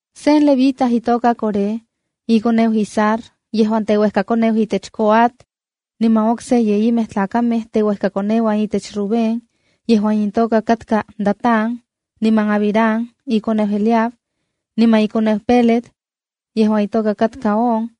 Sen Levita itoka Coré, ikoneu Izhar yejuan teuejkakoneu itech Coat, niman okse yeyimej tlakamej teuejkakoneuan itech Rubén, yejuan intoka katka Datán, niman Abiram ikoneuan Eliab, niman ikoneu Pelet yejuan itoka katka On,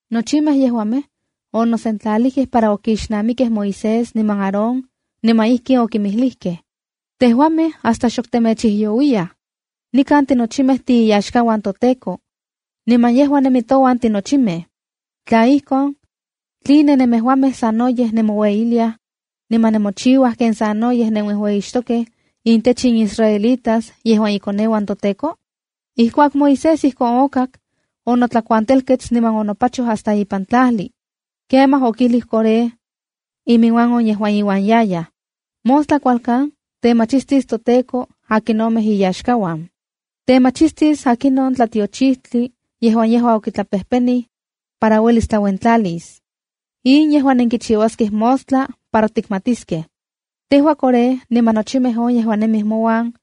Nochimej yejuamej onosentlalijkej para okixnamikej Moisés niman Aarón niman ijkin okinmijlijkej: —Tejuamej hasta xok temechijyouiyaj. Nikan tinochimej tiiyaxkauan toTEKO, niman yejua nemi touan tinochimej. Tla ijkon, ¿tline nemejuamej sanoyej nemoueyiliaj niman nemochiuaj ken sanoyej nenuejueyixtokej intech in israelitas yejuan ikoneuan toTEKO? Ijkuak Moisés ijkon okak, onotlakuantelkets niman onopachoj hasta ipan tlajli. Kemaj okijlij Coré iminuan on yejuan iuan yayaj: —Mostla kualkan temachistis toTEKO akinomej iyaxkauan. Temachistis akinon tlatiochijtli yejuan yejua okitlapejpenij para uelis tlauentlalis. In yejua nenkichiuaskej mostla para tikmatiskej: Tejua Coré, niman nochimej on yejuan nemij mouan,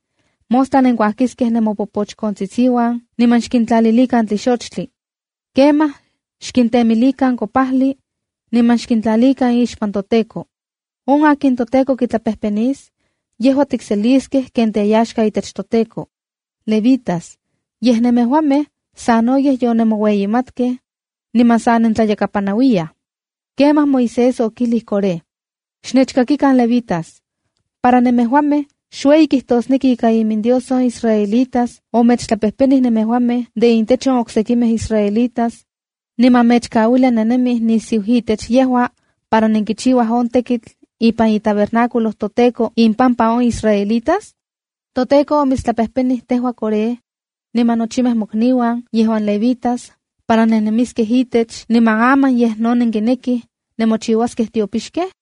mostla nenkuajkiskej nemopopochkontsitsiuan, xkintlalilikan tlixochtli. Kemaj xkintemilikan kopajli niman xkintlalikan ixpan toTEKO. On akin toTEKO kitlapejpenis, yejua tikseliskej ken teyaxka itech toTEKO. Levitas, yej nemejuamej sanoyej yonemoueyimatkej niman sa nentlayakapanauiyaj. Kemaj Moisés okijlij Coré: —¡Xnechkakikan, levitas! Para nemejuamej, ¿xueyi kijtosneki ika iminDios on israelitas omechtlapejpenij nemejuamej de intech on oksekimej israelitas, niman mechkauilia nennemij nisiu itech yejua para nenkichiuaj on tekitl ipan itabernáculo toTEKO, impampa on israelitas? ToTEKO omitstlapejpenij tejua, Coré, niman nochimej mokniuan yejuan levitas para nennemiskej itech, ¿niman aman yej no nenkinekij nemochiuaskej tiopixkej?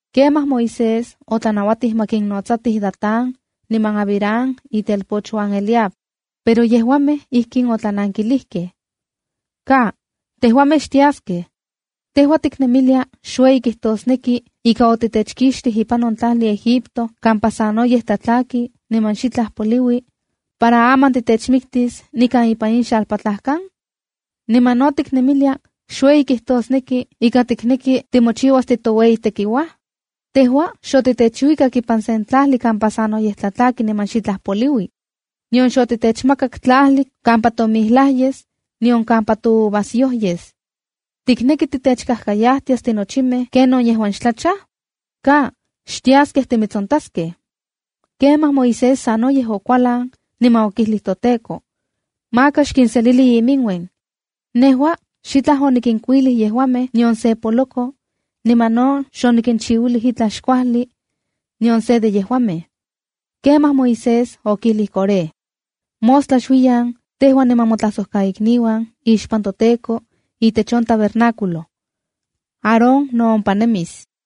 Kemaj Moisés otlanauatij ma kinotsatij Datán niman Abiram itelpochuan Eliab, pero yejuamej ijkin otlanankilijkej: —¡Ka, tejuamej xtiaskej! ¿Tejua tiknemilia xueyi kijtosneki ika otitechkixtij ipan on tlajli Egipto kampa sanoyej tlatlaki niman xitlaj poliui, para aman titechmiktis nikan ipan in xalpatlajkan? ¿Niman no tiknemilia xueyi kijtosneki ika tikneki timochiuas titoueyitekiuaj? Tejua xotitechuikak ipan sen tlajli kampa sanoyej tlatlaki niman xitla poliui. Nion xotitechmakak tlajli kampa tomijlaj yes, nion kampa touvasyo yes. ¿Tikneki titechkajkayajtias tinochimej kenon yejuan xtlachaj? Ka, ¡xtiaskej timitsontaskej! Kemaj Moisés sanoyej okualan, niman okijlij toTEKO: —¡Maka xkinselili iminuen! Nejua xitlaj onikinkuilij yejuamej, nion se poloko, niman no xonikinchiuilij itlaj xkuajli nion se de yejuamej. Kemaj Moisés okijlij Coré: —Mostla xuiyan, tejua niman motlajsojtlaikniuan, ixpan toTEKO itech on tabernáculo. Aarón no ompa nemis.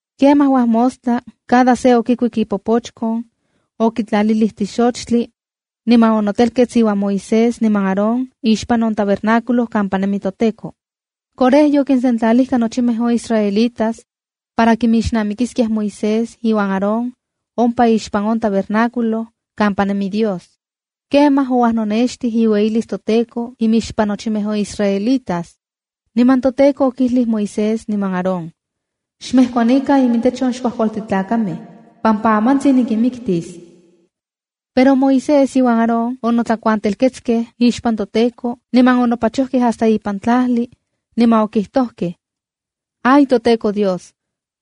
Kemaj uajmostla, cada se okikuik ipopochkon, okitlalilij tlixochtli niman okitemilij kopajli niman onotelkets iuan Moisés niman Aarón ixpan on tabernáculo kampa nemi toTEKO. Coré yokinsentlalijka nochimej on israelitas para kixnamikiskiaj Moisés iuan Aarón ompa ixpan on tabernáculo kampa nemi Dios. Kemaj ouajnonextij iueyilis toTEKO imixpan nochimej on israelitas. Niman toTEKO okijlij Moisés niman Aarón: —Xmejkuanikan imintech in xkuajkualtin tlakamej, pampa amantsin nikinmiktis. Pero Moisés iuan Aarón onotlakuantelketskej ixpan toTEKO niman onopachojkej hasta ipan tlajli, niman okijtojkej: —¡Ay toTEKO Dios!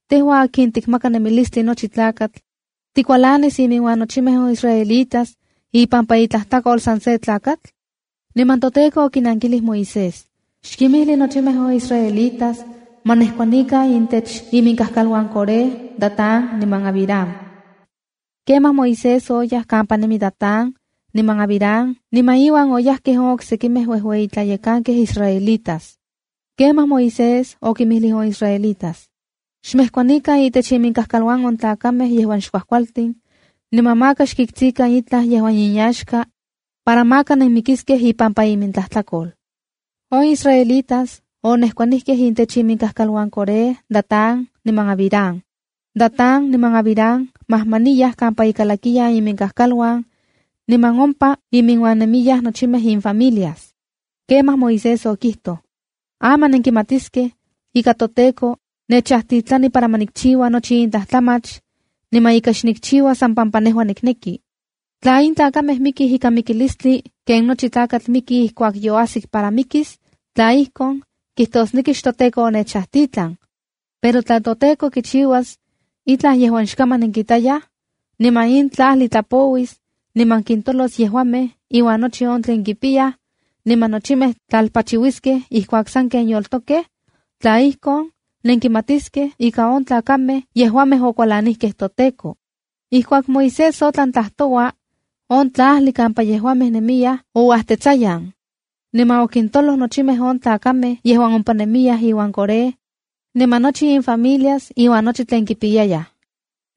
Tejua akin tikmaka nemilistli nochi tlakatl, ¿tikualanis iminuan nochimej on israelitas ipampa itlajtlakol san se tlakatl? Niman toTEKO okinankilij Moisés: —Xkimijli nochimej on israelitas ma nejkuanikan intech iminkajkaluan Coré, Datán niman Abiram. Kemaj Moisés oyaj kampa nemi, Datán niman Abiram, niman iuan oyajkej on oksejkimej uejueyi tlayekankej israelitas. Kemaj Moisés okinmijlij on israelitas: —Xmejkuanikan itech iminkaj kal on tlakamej yejuan xkuajkualtin, niman maka xkitskikan itlaj yejuan inyaxka para maka nenmikiskej ipampa imintlajtlakol. On israelitas onejkuanijkej itech iminkajkal Coré, Datán niman Abiram. Datán niman Abiram majmaniyaj kampa ikalakiyan iminkajkal niman ompa iminuan nemiyaj nochimej infamilias. Kemaj Moisés okijtoj: —Aman nenkimatiskej ika toTEKO nechajtitlani para ma nikchiua nochi in tlajtlamach, niman ika xnikchiua san pampa nejua nikneki. Tla in tlakamej mikij ikan mikilistli ken nochi tlakatl miki ijkuak yoajsik para mikis, tla ijkon, kijtosneki xtoTEKO onechajtitlan. Pero tla toTEKO kichiuas itlaj yejuan xkaman nenkitayaj, niman in tlajli tlapouis niman kintolos yejuamej iuan nochi on tlen kipiyaj, niman nochimej tlalpachiuiskej ijkuak sanken yoltokej, tla ijkon, nenkimatiskej ika on tlakamej yejuamej okualanijkej toTEKO. Ijkuak Moisés otlan tlajtoua, on tlajli kampa yejuamej nemiyaj ouajtetsayan, niman okintoloj nochimej on tlakamej yejuan ompa nemiyaj iuan Coré, niman nochi infamilias iuan nochi tlen kipiyayaj.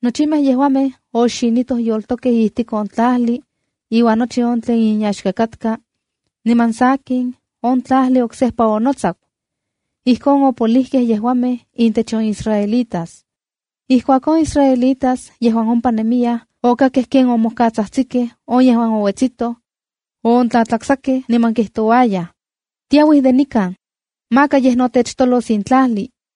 Nochimej yejuamej oxinitoj yoltokej ijtik on tlajli iuan nochi on tlen inyaxka katka, niman sakin, on tlajli oksejpa onotsaku. Ijkon opolijkej yejuamej intech on israelitas. Ijkuak on israelitas yejuan ompa nemiyaj okkakej ken omojkatsajtsikej on yejuan ouetsitoj, oontlatlaksajkej niman kijtouayaj: “tiauij de nikan, maka yej no techtolos in tlajli.”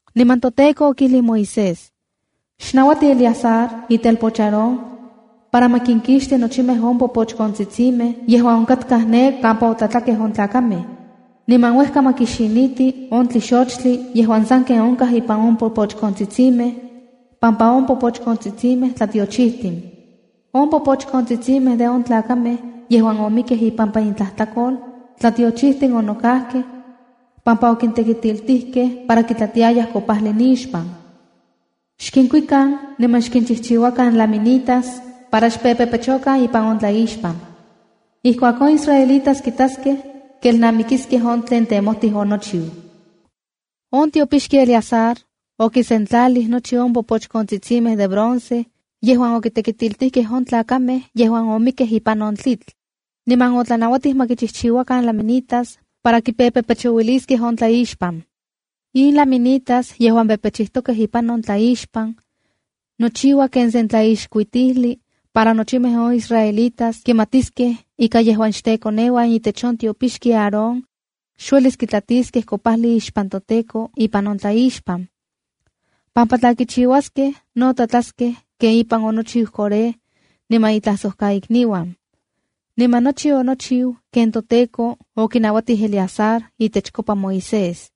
Niman toTEKO okijlij Moisés: “Xnauati Eleazar itelpoch Aarón para ma kinkixti nochimej on popochkontsitsimej yejuan onkatkaj ne kampa otlatlakej on tlakamej, niman uejka ma kixiniti on tlixochtli yejuan sanken onkaj ipan on popochkontsitsimej pampa on popochkontsitsimej tlatiochijtin. On popochkontsitsimej de on tlakamej yejuan omikkej ipampa intlajtlakol, tlatiochijtin onokajkej pampa okintekitiltijkej para kitlatiayaj kopajli nixpan. Xkinkuikan niman xkinchijchiuakan láminitas para xpepepechokan ipan on tlaixpan. Ijkuak on israelitas kitaskej, kelnamikiskej on tlen temojtij onochiu.” On tiopixki Eleazar okisentlalij nochi on popochkontsitsimej de bronce yejuan okitekitiltijkej on tlakamej yejuan omikkej ipan on tlitl, niman otlanauatij ma kinchijchiuakan laminitas para ma kimpepechouiliskej ipan on tlaixpan. In laminitas yejuan pepechijtokej ipan on tlaixpan, nochiua ken sen tlaixkuitijli para nochimej on israelitas kimatiskej ika yejuan xtekoneuan itech on tiopixki Aarón, xuelis kitlatiskej kopajli ixpan toTEKO ipan on tlaixpan. Pampa tla kichiuaskej no tlatlaskej ken ipan onochiu Coré niman itlajsokaikniuan. Niman nochi onochiu ken toTEKO okinauatij Eleazar itechkopa Moisés.